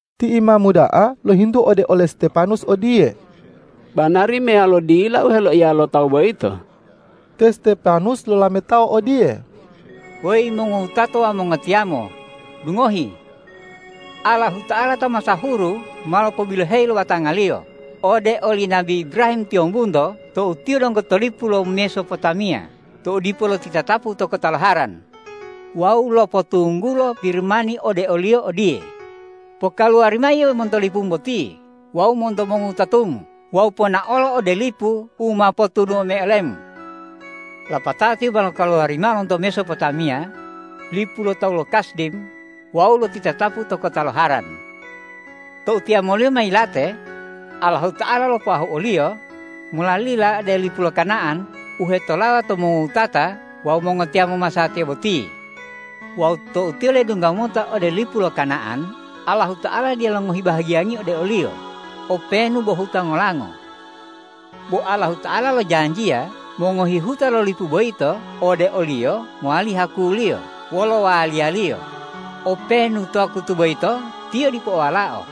Ti imamu da'a lohintu ode ole Stepanus odiye,”Banari meyalo dila u heloiya lo tawu boyito?” Te Stepanus lolametao odiye,”Weyi mongowutato wawu mongotiyamo, dungohi! Allahuta'ala ta masahuru ma lopobiloheyi lo batanga-Liyo ode oli nabi Ibrahim tiyombunto tou tiyo donggo to lipu lo Mesopotamiya, tou dipo lotitatapu to kota lo Haran, wawu lopotunggulo Pirimani ode oliyo odiye, ’Pokaluwari mao yio monto lipumu boti wawu monto mongowutatumu wawu ponaolo ode lipu u ma potunuwo-U mayi olemu.’ Lapatao tiyo ma lokaluwari mao monto Mesopotamiya lipu lo tawu lo Kasdim wawu lotitatapu to kota lo Haran. Tou tiyamoliyo ma yilate, Allahuta'ala lopoahu oliyo molalila ode lipu lo Kana'an u hetolawa to mongowutata wawu mongotiyamo masatiya boti. Wawu tou tiyo ledungga mota ode lipu lo Kana'an, Allahuta'ala dila longohi bahagiyangi ode oliyo, openu bo huta ngolango. Bo Allahuta'ala lojanjiya mongohi huta lo lipu boyito ode oliyo mowali hakuliyo wolo waliyaliyo, openu to wakutu boyito tiyo dipo o walao.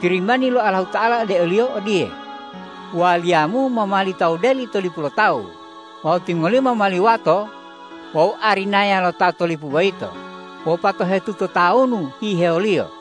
Pirimani lo Allahuta'ala ode oliyo odiye, ’Waliyamu ma mowali tawu deli to lipu lo tawu wawu timongoliyo ma mowali wato wawu arinaya lo ta to lipu boyito wopatohetuto tawunu hihewoliyo.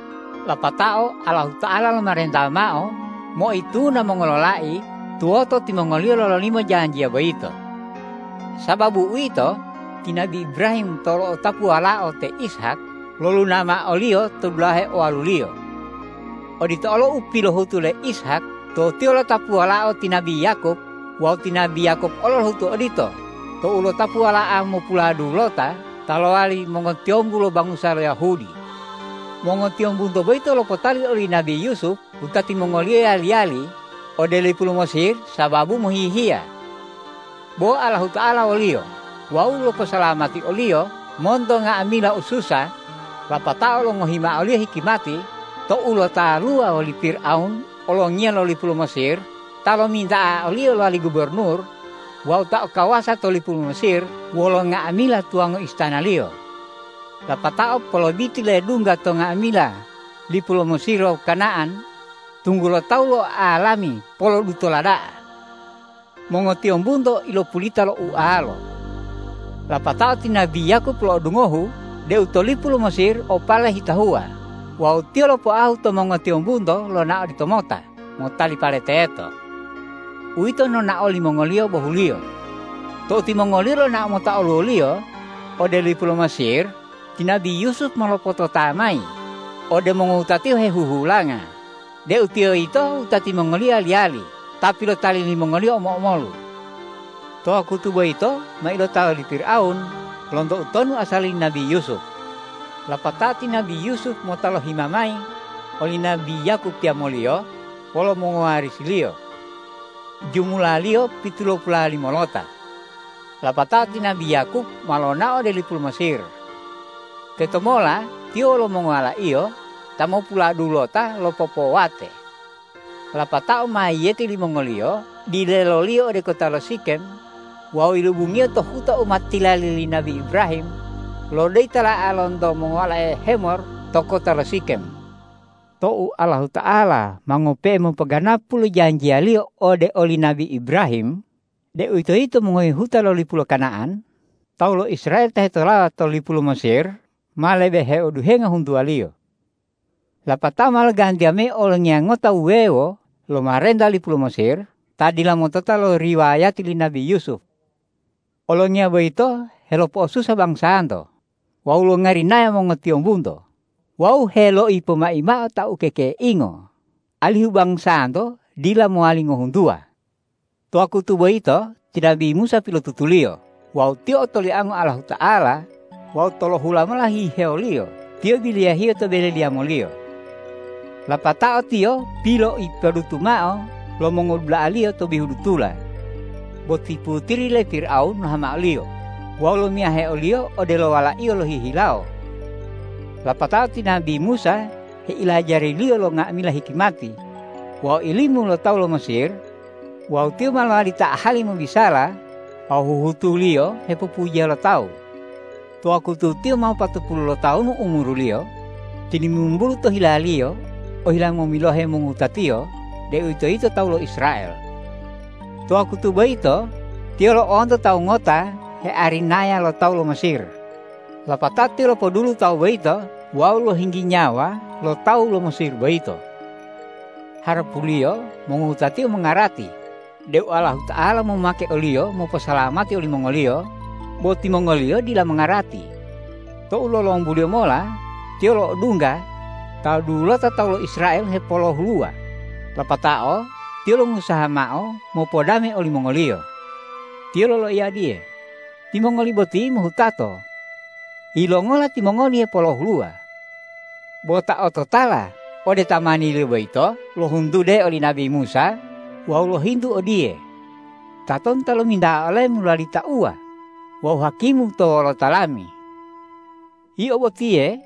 Lapatao Allahuta'ala lomarenta mao moituna mongololai tuwoto timongoliyo lololimo janjiya boyito. Sababu uwito, ti nabi Ibrahim tou lo'otapu walao te Ishak, loluna mao oliyo to dulahe owaluliyo. Odito olo u pilohutu le Ishak tou tiyo lo'otapu walao ti nabi Yakob, wawu ti nabi Yakob olo lohutu odito tou lo'otapu wala'a mopuladulota ta lowali mongotiyombu lo bangusa lo Yahudi. Mongotiyombunto boyito lopotali oli nabi Yusup wutati mongoliyo yali-yali ode lipu lo Mesir sababu mohihiya. Bo Allahuta'ala woliyo wawu loposalamati oliyo monto nga'amila ususa, lapatao longohi mao oliyo hikimati tou lotaluwa woli Pirawun olongiya lo lipu lo Mesir ta lominta'a oliyo lowali gubornur wawu ta o kawasa to lipu lo Mesir wolo nga'amila tuwango istanaliyo. Lapatao polobiti ledungga to nga'amila lipu lo Mesir wawu Kana'an, tunggulo tawu lo'oalami polodutola da'a. Mongotiyombunto ilopulita lo ualo. Lapatao ti nabi Yakob lo'odungohu deu to lipu lo Mesir o pale hetahuwa wawu tiyo lopoahu to mongotiyombunto lonao oditomota motali pale teto. Uwito nonao limongoliyo bohuliyo. Tou timongoliyo lonao mota oluwoliyo ode lipu lo Mesir, ti nabi Yusup ma lopotota mayi ode mongowutatiyo hehuhulanga deu tiyo yito wutati mongoliyo yali-yali ta pilotali limongoliyo omo-omolu. To wakutu boyito ma ilotawa le Pirawun lonto utonu asali li nabi Yusup. Lapatao ti nabi Yusup mota loihama mayi oli nabi Yakob tiyamoliyo wolo mongowarisiliyo. Jumulaliyo pitulopulalimolota. Lapatao ti nabi Yakob ma lonao ode lipu lo Mesir. Tetomola tiyo wolo mongowalaiyo ta mopuladulota lopopowate. Lapatao mayiyeti limongoliyo dileloliyo ode kota lo Sikem wawu yilobungiyo to huta u ma tilali li nabi Ibrahim lo doyi tala'a lonto mongowalae Hemor to kota lo Sikem. Tou Allahuta'ala ma ngope'e mopoganapu lo janjiyaliyo ode oli nabi Ibrahim, deuwitoyito mongohi huta lo lipu lo Kana'an, tawu lo Israel ta hetolawa to lipu lo Mesir ma lebe heoduhenga huntuwaliyo. Lapatao ma logantiya mayi olongiya ngota wuwewo lomarenta lipu lo Mesir ta dila motota lo riwayati li nabi Yusup. Olongiya boyito helopo'osusa bangusanto wawu longarinaya mongotiyombunto wawu heloipomai mao ta kekeingo, alihu bangusanto dila mowali ngohuntuwa. To wakutu boyito ti nabi Musa pilotutuliyo wawu tiyo otoliango Allahuta'ala wawu tolohula mola hihewoliyo tiyo biliyahiyo to bele liyamoliyo. Lapatao tiyo piloipodutu mao lo mongodula'aliyo to bihu dutula, bo ti putiri le Pirawun lohama oliyo wawu lomiyahe oliyo odelo walaiyo lohihilawo. Lapatao ti nabi Musa heilajariliyo lo nga'amila hikimati wawu ilimu lo tawu lo Mesir, wawu tiyo ma lowali ta ahali mobisala wawu huhutuliyo hepopujiya lo tawu. To wakutu tiyo ma wopatopulu lotawunu umuruliyo, tilimimbulu to hilaliyo ohila momilohe mongowutatiyo, deuwitoyito tawu lo Israel. To wakutu boyito tiyo lo'onto tawu ngota hearinaya lo tawu lo Mesir, lapatao tiyo lopodulu tawu boyito wawu lohinggi nyawa lo tawu lo Mesir boyito. Harapuliyo mongowutatiyo mongarati deu Allahuta'ala momake oliyo moposalamati olimongoliyo, bo timongoliyo dila mongarati. Tou lolombuliyo mola tiyo lo'odungga ta dulota tawu lo Israel hepolohuluwa, lapatao tiyo longusaha mao mopodame olimongoliyo. Tiyo loloiya odiye, ’Timongoli boti mohutato. Yilongola timongoli hepolohuluwa?’ Bo ta o totala ode tamaniliyo boyito lohuntudeo oli nabi Musa wawu lohintu odiye, ’Tatonu ta lominta'a olemu lowali tauwa wawu hakimu to wolota lami? Yio botiye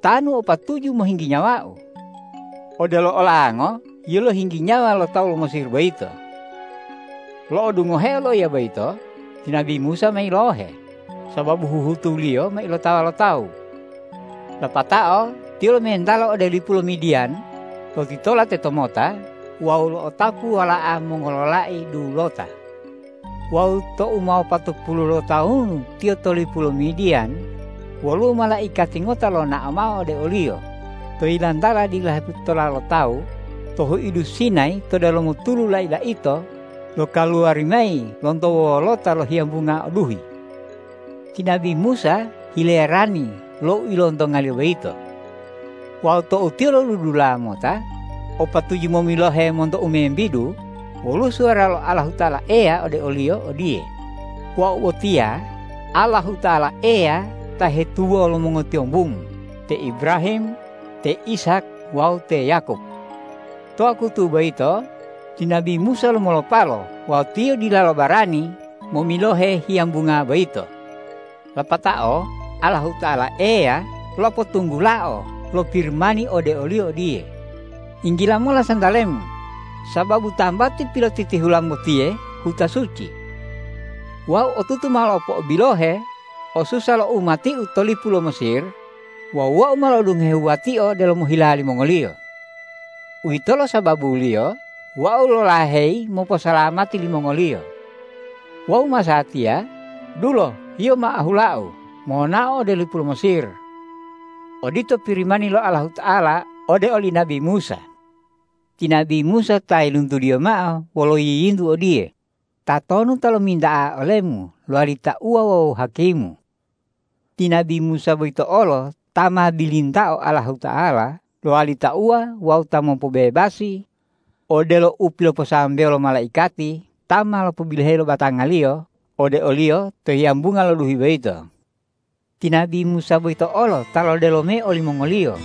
tanu o patuju mohinggi nyawau, odelo olango yio lohinggi nyawa lo tawu lo Mesir boyito.’ Lo'odungoheo loiya boyito, ti nabi Musa ma yilohe sababu huhutuliyo ma ilotawa lo tawu. Lapatao tiyo lomentalo ode lipu lo Midiyan, lotitola tetomota wawu lo'otapu wala'a mongololai dulota. Wawu tou ma wopatopulu lotawunu tiyo to lipu lo Midiyan, woluwo malaikati ngota lonao mao ode oliyo to yilantala dila hepotitola lo tawu to huidu Sinayi to delomo tulu lai-laito lokaluwari mayi lonto wolota lo hiyambunga o duhi. Ti nabi Musa hilerani lo u ilontongaliyo boyito. Wawu tou tiyo lodudula mota o patuju momilohe monto u membidu, woluwo suwara lo Allahuta'ala Eya ode oliyo odiye, ’Wau botiya Allahuta'ala Eya ta hetubo lo mongotiyombumu, te Ibrahim, te Ishak wawu te Yakob.’ To wakutu boyito ti nabi Musa lomolopalo wawu tiyo dilalo barani momilohe hiyambunga boyito. Lapatao Allahuta'ala Eya lopotunggulao lo Pirimani ode oliyo odiye, ’Yinggila mola santalemu, sababu tambati pilotitihulamu botiye huta suci. Wau otutu ma lopo'obilohe osusa lo umati-U to lipu lo Mesir wawu Wau ma lo'odungohe wuwatio delomo hilawo limongoliyo. Uwitolo sababuliyo Wau lolaheyi moposalamati limongoliyo. Wawu masatiya dulo yio ma ahula-U monao ode lipu lo Mesir.’ Odito Pirimani lo Allahuta'ala ode oli nabi Musa. Ti nabi Musa ta yiluntudiyo mao wolo yiyintu odiye, ’Tatonu ta lominta'a olemu lowali tauwa wawu hakimu?’ Ti nabi Musa boyito olo ta ma bilintao Allahuta'ala lowali tauwa wawu ta mopobebasi, odelo u piloposambewo lo malaikati ta ma lopobiloheyi lo batangaliyo ode oliyo to hiyambunga lo duhi boyito. Ti nabi Musa boyito olo ta lodelo mayi olimongoliyo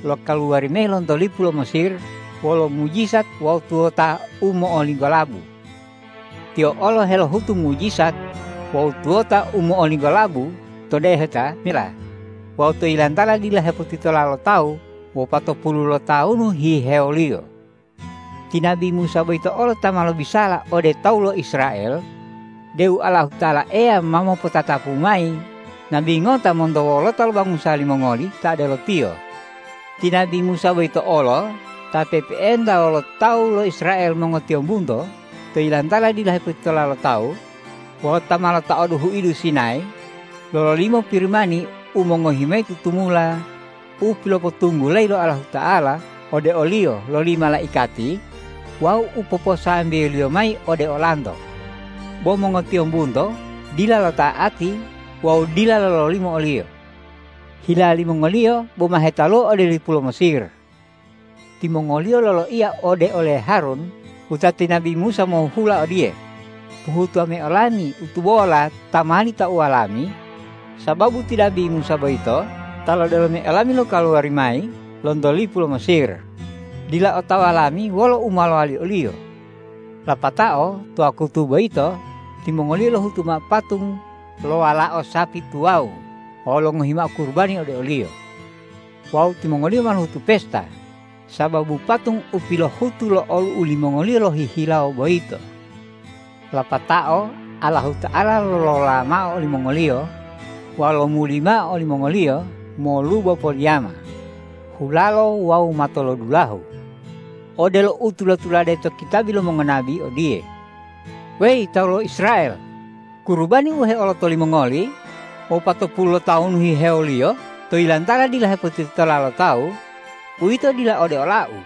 lokaluwari mayi lonto lipu lo Mesir wolo mujijat wawu tuwota u mo'olinggolabu. Tiyo olo helohutu mujijat wawu tuwota u mo'olinggolabu to Deheta Mela wawu to yilantala dila hepotitola lo tawu wopatopulu lotawunu hihewoliyo. Ti nabi Musa boyito olo ta ma lobisala ode tawu lo Israel deu Allahuta'ala Eya ma mopotatapu mayi Nabi ngota monto wolota lo bangusa limongoli ta odelo tiyo. Ti nabi Musa boyito olo ta pe'epe'enta wolo tawu lo Israel mongotiyombunto to yilantala dila hepotitola lo tawu wawu ta ma lotaodu huidu Sinayi, lololimo Pirimani u mongohi mayi tutumula u pilopotunggulayi lo Allahuta'ala ode oliyo loli malaikati wawu u poposambewoliyo mayi ode olanto. Bo mongotiyombunto dila lota'ati wawu dila lololimo oliyo. Hila limongoliyo boma hetaluwa ode lipu lo Mesir. Timongoliyo loloiya ode ole Harun wutati nabi Musa mohuhula odiye, ’Pohutuwa mayi olami u tubola ta mowali tauwa lami, sababu ti nabi Musa boyito ta lodelo mayi olami lokaluwari mayi lonto lipu lo Mesir, dila otawa lami wolo u ma lowali oliyo.’ Lapatao to wakutu boyito timongoliyo lohutu mao patung lo walao sapi tuwawu wawu longohi mao kurubani ode oliyo. Wawu timongoliyo ma lohutu pesta sababu patung u pilohutu lo olu'u li mongoliyo lohihilawo boyito. Lapatao Allahuta'ala lolola mao olimongoliyo wawu lomuli mao olimongoliyo molubo poliyama, hulalo wawu matolodulahu, odelo u tula-tulade to kitabi lo mongonabi odiye, ’Weyi tawu lo Israel, kurubani u heoloto limongoli wopatopulu lotawunu hihewoliyo to yilantala dila hepotitola lo tawu, uwito dila ode ola-U.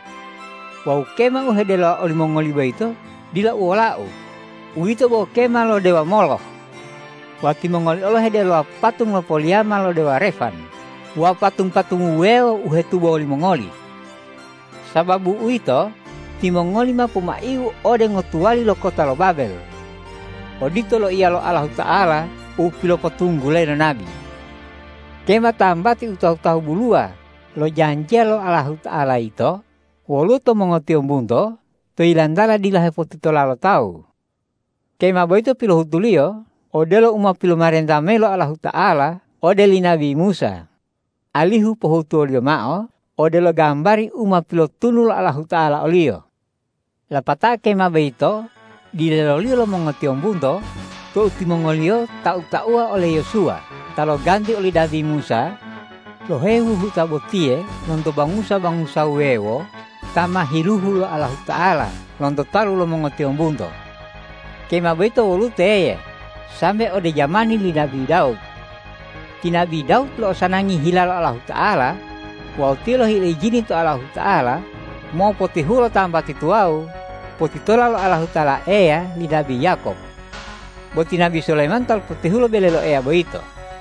Wawu kema u hedelowa olimongoli boyito dila uwola-U, uwito bo kema lo dewa Moloh. Wawu timongoli olo hedelowa patung lo poliyama lo dewa Refan wawu patung-patung wuwewo u hetubo limongoli. Sababu uwito, timongoli ma pomai-U ode ngotuwali lo kota lo Babel.’ Odito loiya lo Allahuta'ala u pilopotunggulayi lo nabi. Kema tambati u tahu-tahu buluwa lo janjiya lo Allahuta'ala yito woluwo to mongotiyombunto to yilantala dila hepotitola lo tawu. Kema boyito pilohutuliyo odelo u ma pilomarenta mayi lo Allahuta'ala ode li nabi Musa, alihu pohutuwoliyo mao odelo gambari u ma pilotunu lo Allahuta'ala oliyo. Lapatao kema boyito dileloliyo lo mongotiyombunto tou timongoliyo tau-tauwa ole Yosuwa ta loganti oli nabi Musa, lohehu huta botiye lonto bangusa-bangusa wuwewo ta ma hiluhu lo Allahuta'ala lonto talu lo mongotiyombunto. Kema boyito woluwo teye sambe ode jamani li nabi Dawud. Ti nabi Dawud lo'osanangi hila lo Allahuta'ala wawu tiyo lohile ijini to Allahuta'ala mopotihulo tambati tuwawu potitola lo Allahuta'ala Eya li nabi Yakob. Bo ti nabi Sulayiman ta lopotihulo bele lo Eya boyito.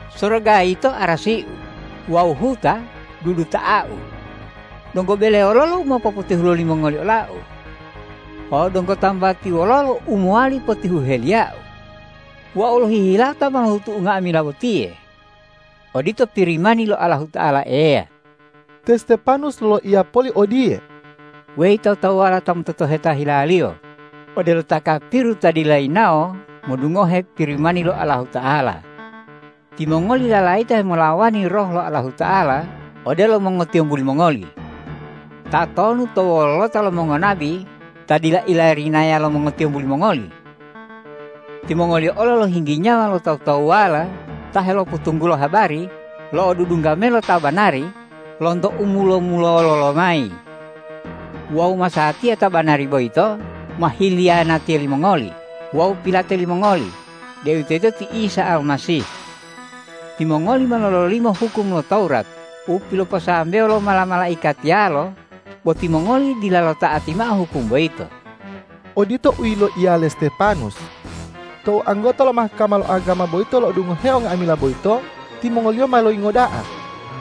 ’Soroga yito arasi-U wawu huta duduta'a-U. Donggo bele wololo u ma popotihulo limongoli ola-U? Wawu donggo tambati wololo u mowali potihuheliya-U? Wau lohihilawo ta ma lohutu nga'amila botiye.’ Odito Pirimani lo Allahuta'ala Eya.” Te Stepanus loloiya poli odiye,”Weyi tawu-tawuwala ta mototoheta hilaliyo odelo ta kapiru ta dila yinawo modungohe Pirimani lo Allahuta'ala! Timongoli lalayita hemolawani Roh lo Allahuta'ala odelo mongotiyombu limongoli. Tatonu to wolota lo mongonabi ta dila ilarinaya lo mongotiyombu limongoli? Timongoliyo olo lohinggi nyawa lo tawu-tawuwala ta helopotunggulo habari lo odudungga mayi lo Ta banari lonto u mulo-mulolo lomayi. Wawu masatiya Ta banari boyito ma hiliyanatiya limongoli wawu pilate limongoli, deuwitoyito ti Isa Almasih. Timongoli ma lololimo hukum lo Tawurat u piloposambewo lo mala-malaikatiyalo, bo timongoli dila lota'ati mao hukum boyito.” Odito u yiloiya le Stepanus. Tou anggota lo Mahkama lo agama boyito lo'odungoheo nga'amila boyito, timongoliyo ma loyingo da'a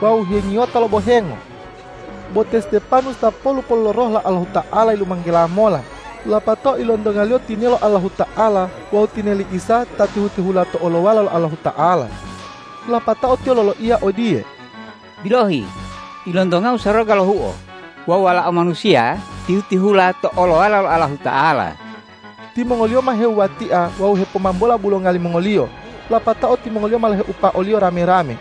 wawu hengiyota lo bohengo. Bo te Stepanus ta polu-polu lo Roh lo Allahuta'ala yilumanggela mola, lapatao ilontongaliyo tinelo Allahuta'ala wawu tineli Isa ta tihu-tihula to olowala lo Allahuta'ala. Lapatao tiyo loloiya odiye,”Bilohi, ilontongau soroga lohuo wawu Walao Manusiya tihu-tihula to olowala lo Allahuta'ala!” Timongoliyo ma hewuwatia wawu hepomambola bulonga limongoliyo, lapatao timongoli ma loheupa oliyo rame-rame.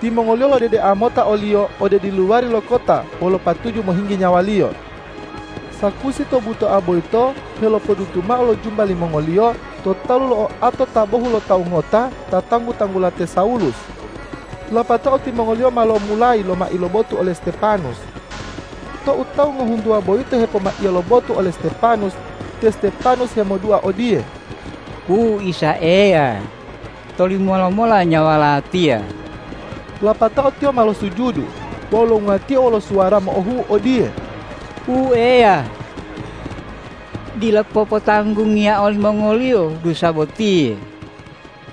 Timongoliyo lodedea mota oliyo ode diluwari lo kota wolo patuju mohinggi nyawaliyo. Sakusi to butoa boyito helopodutu mao lo jumba limongoliyo to talu lo oato ta bohulotawu ngota ta tanggu-tanggula te Sawulus. Lapatao timongoliyo ma lomulayi lomai lo botu ole Stepanus. Tou tawu ngohuntuwa boyito hepomaiya lo botu ole Stepanus, te Stepanus hemodua odiye,”Wu Isa Eya, tolimowa lomola nyawa latiya.” Lapatao tiyo ma losuju wawu longuwatio wolo suwara mo'ohu'u odiye,”Wu Eya, dila popotanggungiya olimongoliyo dusa botiye!”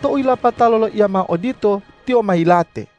Tou yilapato loloiya mao odito, tiyo ma yilate.